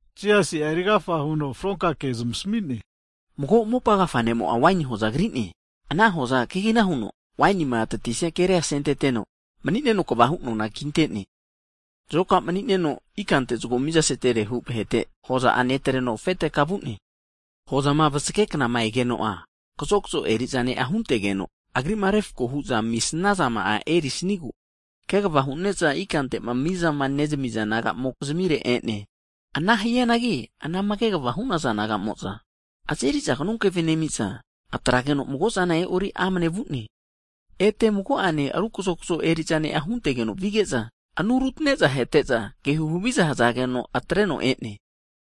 Jisasi'a erigafa huno fronka kea zamasami'ne, Mago mopa agafa ne'mo'a waini hoza kri'ne. Ana hoza kegina huno, wainima tatisia keria asenteteno, mani'neno kvahu nona kinte'ne. Hagi zoka umani'neno enaku ikante zago miza seterehu (rent) vahete, hoza'a netreno afete ka vu'ne. Hagi hozama vasage knama egeno'a, kazokzo eri'za ne'a huntegeno, agri'ma refko hu'za amisnazama'a erisnigu, kegava hune'za ikantema mizama (rent) nezamiza naga'mokizmire e'ne. Ana hianagi, anama kegavama hu'naza naga'mo'za, azeri'za knonkeve nemi'za, atrageno mago'zana e'ori amane vu'ne. Ete mago'ane ru kazokazo eri'za ne'a huntegeno vige'za, anu rutane'za ahete'za, ke huhaviza hazageno atreno e'ne.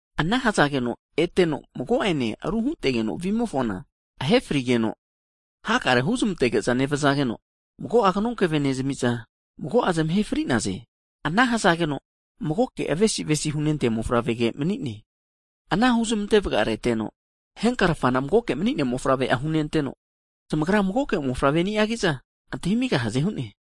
Ana hazageno ete mago'ene huntegeno vimofona, ahe frigeno hakare'a huzmantege'za nevazageno, mago'a knonkeve nezami'za, mago'a zamahe fri'naze. Ana hazageno, magoke avesi avesi hunentea mofavrege mani'ne. Ana huzmante vagareteno, henkarfana magoke mani'nea mofavre'a hunenteno, zamagra magoke mofavre ni'agi'za antahimigahaze hu'ne.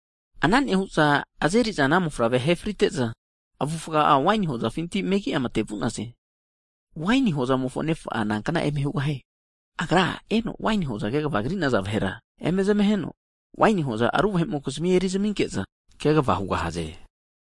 Ana nehu'za azeri'za ana mofavrea ahe frite'za, avufa'a waini hozafinti megi'a mate vu'naze. Hagi waini hozamofo nefa'a nankna eme hugahie? Agra eno waini hoza kegava krinaza vahera eme zmaheno, waini hoza ru vahe'mokizmi eri zaminke'za, kegava hugahaze.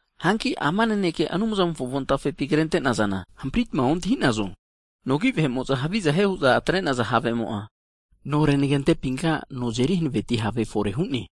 Hanki ama naneke Anumzamofo avontafepi krente'nazana hampritma ontahinazo? Nogi vahe'mo'za haviza hie huza atre'naza havemo'a, no renage antepinka no azeri hanaveti have fore hu'ne.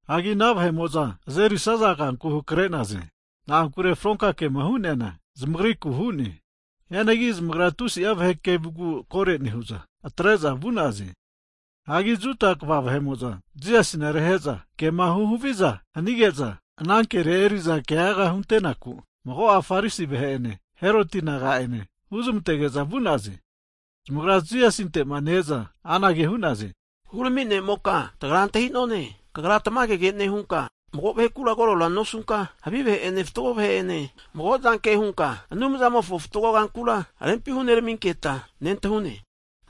Hagi ana vahe'mo'za azeri'saza kanku hakre'naze. Na'ankure fronka kema hu'neana zamagriku hu'ne. Hianagi zamagra tusi'a vahe kevugu koro nehu'za atre'za vu'naze. Hagi Juda kva vahe'mo'za Jisasina rehe'za kema huhaviza hanige'za, ana ke eri'za keaga hunte'naku, mago'a farisi vahe'ene, Heroti naga'ane huzmantage'za vu'naze. Zamagrama Jisasinte'ma ne-eza anage hu'naze, Hurami ne'moka, tagra antahi'none, kagra tamagege nehunka, mago vahekura koro nosunka, havi vahe'ene fatgo vahe'ene mago'zanke hunka Anumzamofo fatgo kankura rempi huneraminketa nentahune.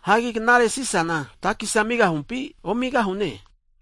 Hagi knare Sisana takesia amigahumpi omigahune?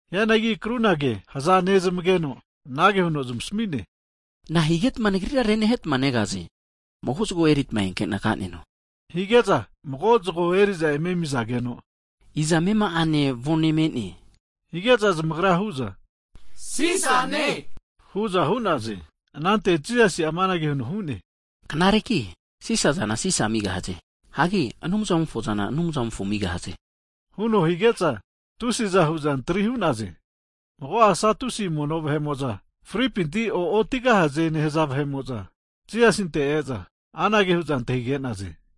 Hianagi krunage haza nezamageno, anage huno zamasami'ne, Na'a higetma Nagrira renahetma negaze? Mago zagoa eritma enkena kaneno, hige'za mago zago eri'za eme amizageno, Iza amema'ane avone me'ne? Hige'za zamagra hu'za, Sisane hu'za hu'naze. Anante Jisasi'a amanage huno hu'ne, Knareki Sisa zana Sisa amigahaze. Hagi Anumzamofo zana, Anumzamofo amigahaze huno hige'za tusiza hu'za antri hu'naze. Hagi mago'a Satusi mono vahe'mo'za (fripinti o'otigahaze nehaza vahe'mo'za) Jisasinte e'za anage hu'za antahige'naze.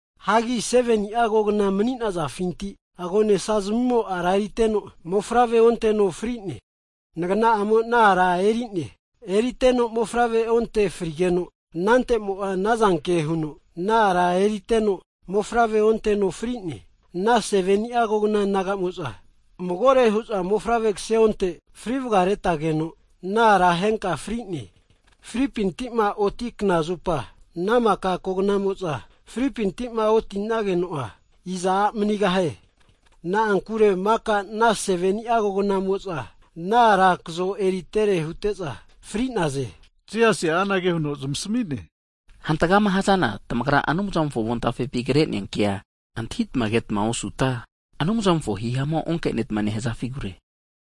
Hagi 7ni'a kogna mani'nazafinti, agonesa zimimo ara eriteno mofavre onteno frine. Nagna'amo ana ara eri'ne. Eriteno mofavre onte frigeno, anante'mo'a anazanke huno ana ara eriteno, mofavre onteno fri'ne. Ana 7ni'a kogna naga'mo'za, magore hu'za mofavre kase onte fri vagaretageno, ana ara henka'a fri'ne. Fripinti'ma oti knazupa, ana maka kognamo'za fripinti'ma oti'nageno'a, iza a' manigahie? Na'ankure maka ana 7ni'a kognamo'za ana ara kazo eritere hute'za fri'naze. Jisasi'a anage huno zamasami'ne, Hantagama hazana, tamagra Anumzamofo avontafepi kre'nea kea antahitama ketma osuta, Anumzamofo hihamu'a onkenetma nehazafigure.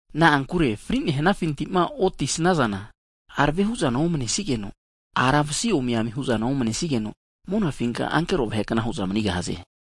Na'ankure fri'nehnafinti'ma oti snazana, arave hu'zana omnesigeno, ara vasi omi ami hu'zana omnesigeno, monafinka ankero vahe'kna hu'za manigahaze.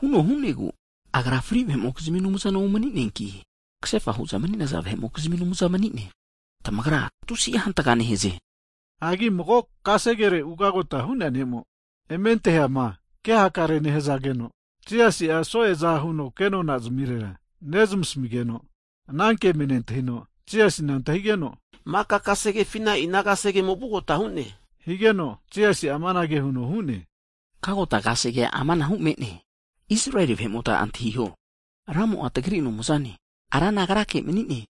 Huno hu'negu, Agra fri vahe'mokizmi Anumzana omani'neanki, kasefa hu'za mani'naza vahe'mokizmi Anumza manine, tamagra tusi'a hantaga nehaze. Hagi mago kasegere ugagota hu'nea ne'mo eme antahiama ke hakare nehazageno, Jisasi'a so'eza huno kenona zamirera nezmasamigeno, ananke eme nentahino, Jisasina antahigeno, Maka kasegefina ina kasegemo vugota hu'ne? Higeno Jisasi'a amanage huno hu'ne, Kagota kasegea amanahu me'ne, Israeli vahe'mota antahiho, Ramo'a tagri Anumzane. Rana agrake mani'ne.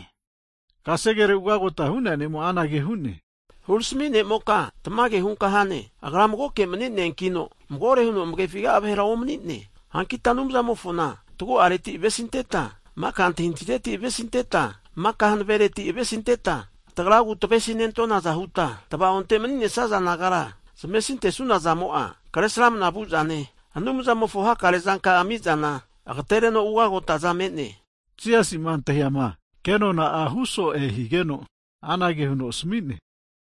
Higeno kasegere ugota hu'nea ne'mo'a anage hu'ne, Hurami ne'moka, tamage hunka hane, Agra magoke mani'neankino magore huno amefiga'a vahera omani'ne. Ana hanigeta Anumzamofona tagu'areti avesinteta, maka antahintahireti avesinteta, maka hanavereti avesinteta, tagragu tavesi nentonaza huta tva'onte maninesaza nagara zmavesinte sunazamo'a, Kresramana vuzane, Anumzamofo hakare zanka'a ami'zana agatereno ugagotaza me'ne. Jisasima antahiama ana ne'mo'ma kenona'a hu so'e higeno, anage huno asami'ne,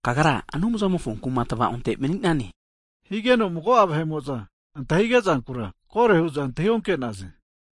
Kagra Anumzamofo kuma tava'onte mani'nane. Higeno mago'a vahe'mo'za antahige zankura koro hu'za antahi onke'naze.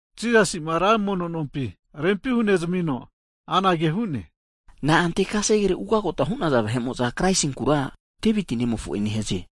Jisasi'ma ra mono nompi rempi hunezamino'a anage hu'ne, Na'ante kasegere ugagota hu'naza vahe'mo'za Kraisinkura, Deviti nemofo'e nehaze?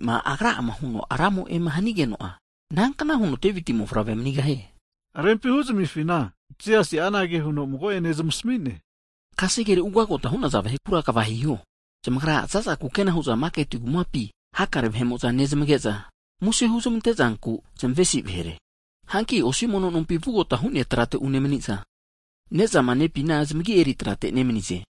Devitima agra'ama huno Ranimo'e hanigeno'a, inankna huno Deviti mofavre manigahie? Rempima huzamifina Jisasi'a anage huno mago'ene zamasami'ne, Kasegere ugagota hu'naza vahekura kva hiho. Zamagra za'za kukena hu'za maketi kumapi vano nehazage'za hakare vahe'mo'za nezmage'za muse huzmante zanku zamavesi vahere. Hanki osi mono nompi vugota hu'nea trate unemaniza, nezama nepina zamagi eri trate nemanize.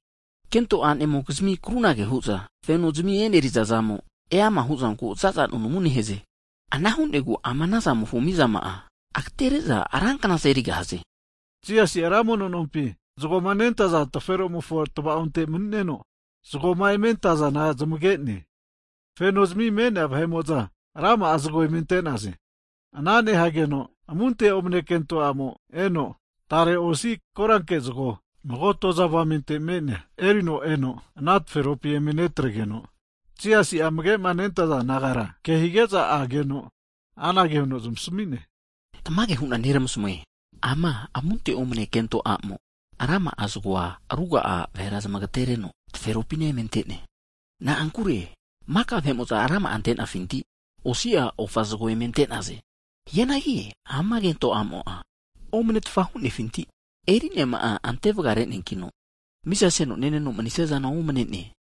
Kento a'nemokizmi krunage hu'za fenozimi eneri'za zamo, eama hu'zanku za'za nunamu nehaze. Ana hu'negu ama anazamofo mizama'a, agatere'za ranknaza erigahaze. Jisasi'a ra mono nompi, zagoma nentaza taferomofo tva'onte mani'neno zagoma eme antazana zmage'ne. Fenozimi me'nea vahe'mo'za rama'a zago eme ante'naze. Ana nehageno amunte omane kento a'mo eno, tare osi koranke zago mago toza avamente me'nea erino ana taferopi eme netregeno, Jisasi'a amage'ma nentaza disaipol nagara ke hige'za ageno anage huno zamasami'ne, Tamage hu'na neramasmue, ama amunte omane kento a'mo rama'a zagoa ruga'a vahera zamagetereno taferopina eme ante'ne. Na'ankure maka vahe'mo'za rama'a ante'nafinti, osi'a ofa zagoa eme ante'naze. Hianagi ama kento a'mo'a amunte omanetfa hunefinti eri'neama'a ante vaga reneankino, miza seno neneno manisiazana omane'ne.